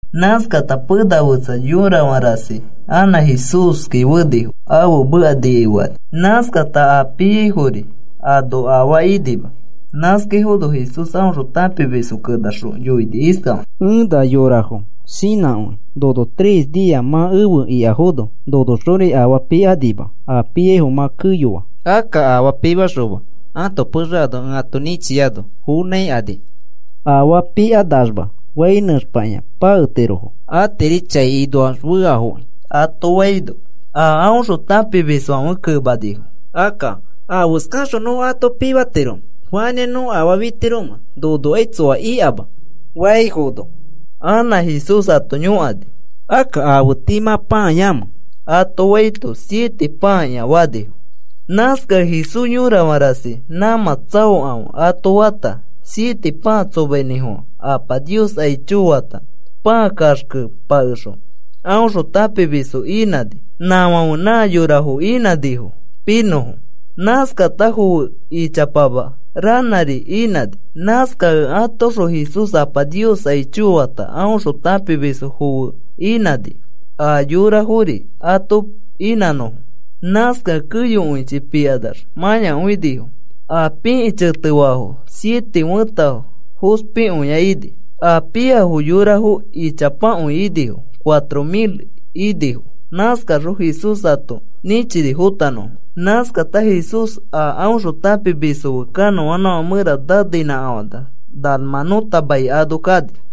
Nãskata pena fetsa yorafã rasi anã Jesúski fenifo ãfe meka nikai fekani. Nãskata a piaifori ano afaa inima. Nãskaifono Jesús aõxõ tãpimisfo kenaxõ yoini iskafakĩ: “Ẽ na yorafo shinãkõi, nono tres nia mã efe ikafono, nonoxori afaa pikanima. A piaifo mã keyoa. Akka afaa pimaxoma ãto pexe ano ẽ ato nĩchiano, fonãikani afaa pikanaxma fai nẽxpakĩa paketirofo. Atiri chai inoax feafoki,” ato faino, a aõxõ tãpimisfãfe kemanifo: “Akka, ¿afeskaxõ nõ ato pimatiromẽ? ¿Fanĩa nõ afaa fitiromẽ, nonokai tsoa ikama?” faifono, anã Jesús ato yõkani: “Akka, ¿afe tii mã pãayamẽ?” ato faito, “Siete pãakĩa,” fanifo. Nãskakẽ Jesús, “Yõrafã rasi nãmã tsaokãfe,” ato fata, siete pãa tsomainĩfofã. Apa Nios aicho fata, pãa kaxke pakexõ aõxõ tãpimisfo inãni. Nãfãferi nã yorafo inãnifo pinõfo. Nãskata foe ichapama ranãri ini. Nãskakẽ atoõxõ Jesús Apa Nios aicho fata, aõxõ tãpimisfo foe inãni a yorafori ato inãnõfo. Nãskakẽ keyokõichi pikanax mãyakõinifo. A pikĩ chetefaafo siete fẽta fospikõia ini. A piafo yorafo ichapakõi inifo, cuatro mil inifo. Nãskaxõ Jesús ato nĩchini fotanõfo. Nãskata Jesús a aõxõ tãpimisfo fe kanõanãfã mẽra naneinãkafanax Dalmanuta mai ano kani.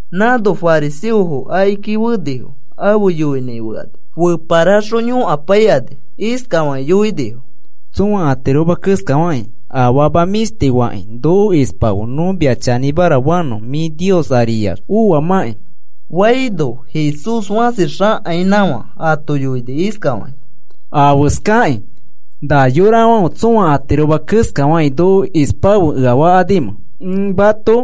Nãno fariseofo akiki fenifo afe yoinãi fekani, feparaxõ yõkapaikani. Iskafakĩ yoinifo: “Tsõa atiroma keskafakĩ afama mĩshtifo fakĩ noko ispafe nõ mia chanĩmara fanõ mĩ Nios ariax oamãki,” faifono, Jesús fãsi xakainãkafã ato yoini iskafakĩ: “¿Afeskakĩ na yorafãfe tsõa atiroma keskafakĩ noko ispafe ea fakanimẽ? Ẽ mato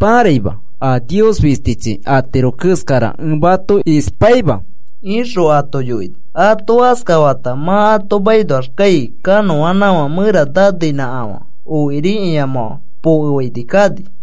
pãraima a Nios fistichi atiro keskara ẽ mato ispaima,” ixõ ato yoini. Ato askafata mã ato makinoax kai kanõanãfã mẽra naneinãkafã okiri ĩamãfã pokefaini kani.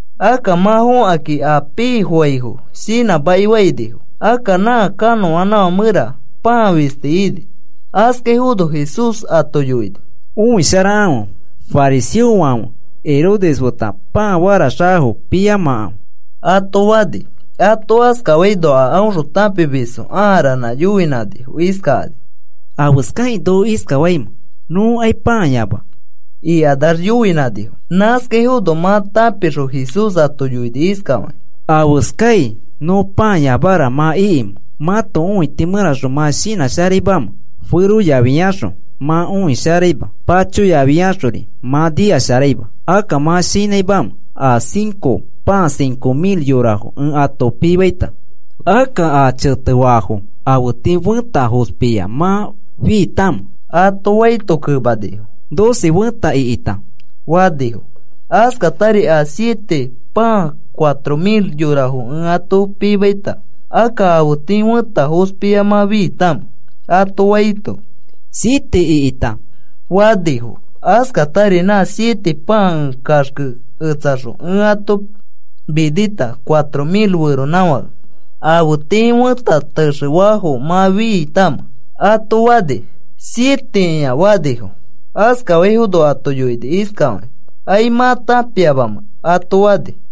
Akka mã fõkakĩ, a pifofaifo shinãmaki fainifo. Akka nã kanõanãfã mẽra pãa fisti ini. Askaifono Jesús ato yoini: “Õisharakãfe. Fariseofãfe Herodes feta pãa faraxakafo piyamakãfe,” ato fani. Ato askafaino, a aõxõ tãpimisfo ãa ranã yoinãnifo iskakani: “¿Afeskakĩ noko iskafaimẽ? Nõkai pãa yama,” ikanax yoinãnifo. Nãskaifono mã tãpixõ Jesús ato yoini iskafakĩ: “¿Afeskai nõ pãayamara mã ikimẽ, mãto õiti mẽraxõ mã shinãsharaimamẽ? Feroyafiaxõ mã õi sharaima, pachoyafiaxori mã nikasharaima. ¿Akka mã shinãimamẽ? A cinco pãa cinco mil yorafo ẽ ato pimaita akka, ¿a chetefaafo afe tii fẽta fospia mã fiitamẽ?” ato faito kemanifo: “Doce fẽta ikita,” fanifo. “Askatari a siete pãa cuatro mil yorafo ẽ ato pimaita, akka, ¿afe tii fẽta fospia mã fiitamẽ?” ato faito, “Siete ikita,” fanifo. “Askatari, ¿nã siete pãa ẽ kaxkeketsaxõ ẽ ato minita cuatro mil feronãfake, afe tii fẽta texefafo mã fiitamẽ?” ato fani. “Sietekĩa,” fanifo. Askafaifono ato yoini iskafakĩ: “¿Ai mã tãpiamamẽ?” ato fani.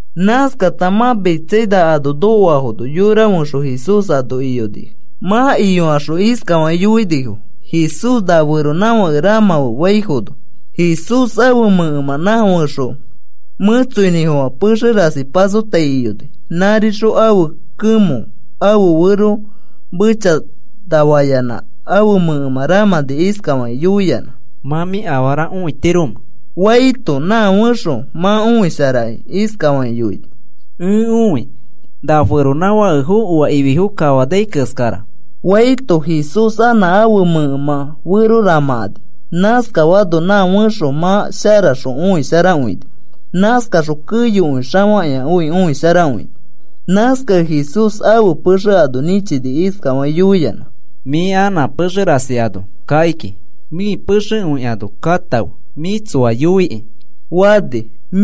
Nãskata mã Betsaida ano nokoafono, yora fẽxo Jesús ano iyonifo. Mã iyokaxõ iskafakĩ yoinifo: “Jesús, na feronãfake ramãfe,” faifono, Jesús ãfe mẽkemã nã fẽxo mẽtsoinĩfofã pexe rasi pasoatai iyoni. Nãrixõ ãfe kemõ ãfe fero mechanafayanã ãfe mẽkemã ramãni iskafakĩ yõkayanã: “¿Mã mĩ afara õitiromẽ?” faito, nã fẽxo mã õisharaki iskafakĩ yoini: “Ẽ õi na feronãfakefo oa ififo kafanai keskara,” faito, Jesús anã ãfe mẽkemã fero ramãkani. Nãskafaano nã fẽxo mã sharaxõ õisharakõini. Nãskaxõ keyokõi xafakĩakõi õisharakõini. Nãskakẽ Jesús ãfe pexe ano nĩchini iskafakĩ yoiyanã: “Mĩ anã pexe rasi ano kakiki, mĩ pexekõi ano katãfe, mĩ tsoa yoikĩ,” fani.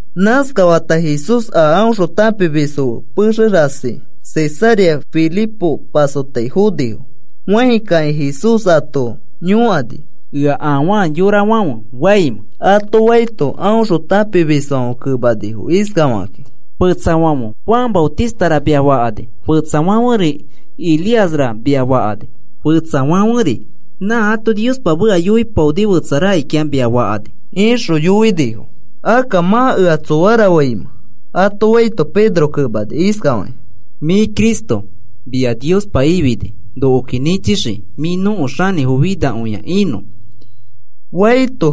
Nãskafata Jesús a aõxõ tãpimisfo fe pexe rasi Cesarea Filipo pasoato fonifo. Fãi kakĩ Jesús ato yõkani: “¿Ea afaa yorafãfe faimẽ?” ato faito, aõxõ tãpimisfãfe kemanifo iskafakakĩ: “Fetsafãfe Juan Maotistara, mia fakani. Fetsafãferi Elíasra mia fakani. Fetsafãferi nã ato Niospa meka yoipaoni fetsa rakikĩa mia fakani,” ixõ yoinifo. “Akka, ¿mã ea tsoara faimẽ?” ato faito, Pedro kemani iskafakĩ: “Mĩ Cristo mia Niospa ifini nokoki nĩchixii mĩ nõko xanĩfo finakõia inõ,” faito,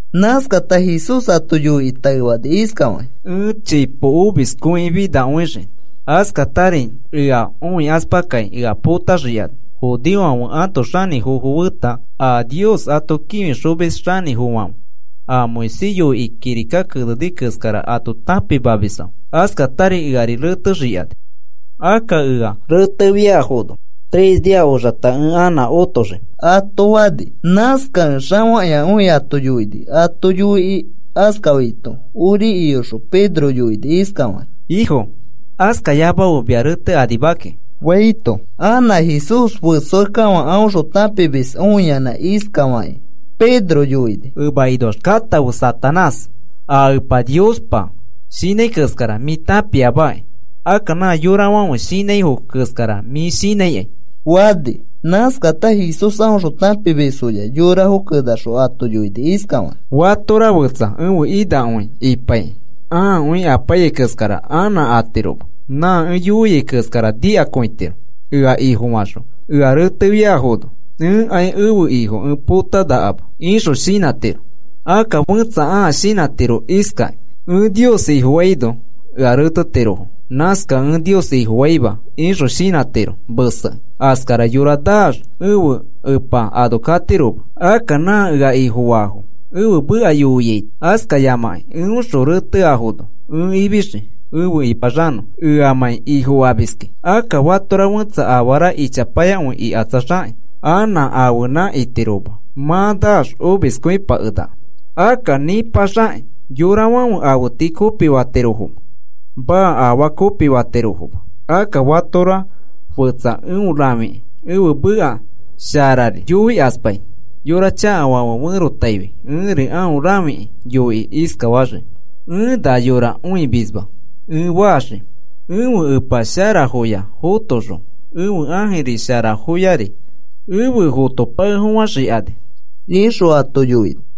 Nãskata Jesús ato yoikĩ taefani iskafakĩ: “Ẽ chipo omiskõi finakõixii. Askatari ea õikaspakakĩ ea potaxikani, judeofãfe ãto xanĩfofo feta a Nios ato kĩfixomis xanĩfofãfe a Moisés yoikĩ kirika keneni keskara ato tãpimamisfãfe. Askatari ea retexikani, akka ea retefiafono tres nia oxata ẽ anã otoxii,” ato fani. Nãskakẽ xafakĩakõi ato yoini. Ato yoikĩ askafaito ori iyoxõ Pedro yoini iskafakĩ: “Ifo, askayamafe mia retekanima kiki,” faito, anã Jesús fesoakekafã aõxõ tãpimisfo õiyanã iskafakĩ Pedro yoini: “Emakinoax katãfe, Satanás. A Epa Niospa shinãi keskara mĩ tãpiamaki. Akka nã yorafãfe shinãifo keskara mĩ shinãikai,” fani. Nãskata Jesús aõxõ tãpimisfoya yorafo kenaxõ ato yoini iskafakĩ: “Fatora fetsa ẽfe inakõi ipaikĩ ãakõi apaiyai keskara anã atiroma. Nã ẽ yoiai keskara nikakõitiro. ‘Ẽfe Ifoxõ ea retefiaifono ẽkai ẽfe Ifo ẽ potapakenakama,’ ixõ shinãtiro. Akka fẽtsa ãa shinãtiro iskakĩ: ‘Ẽ Nios Ifofaito ea retetirofo. Nãskakẽ ẽ Nios Ifofaima,’ ixõ shinãtiro mesekĩ. Askara yora naax ẽfe Epa ano katiroma. Akka nã ea Ifofaa, ẽfe meka yoiaito askayamãkĩ eõxõ reteafono ẽ ifixii efe ĩpaxanõ eamãi Ifofamiskẽ. Akka fatora fetsa afara ichapayakõi ikatsaxakĩ, anã ãfenã itiroma. Mã naax omiskõipakenaka. Akka, ¿nĩpaxakĩ yorafãfe afe tii kopifatirofomẽ? Maa, afaa kopifatirofoma. Akka fatora fetsa eõ rãfikĩ, ẽfe meka sharari yoikaspai yora chakafãfe ferotaifi ẽri aõ rãfikĩ yoikĩ iskafaxii: ‘Ẽ na yora õimisma,’ ẽ faxii ẽfe Ẽpa sharafoya fotoxõ, ẽfe ãjiri sharafori efe fotopakefofãxikani,” ixõ ato yoini.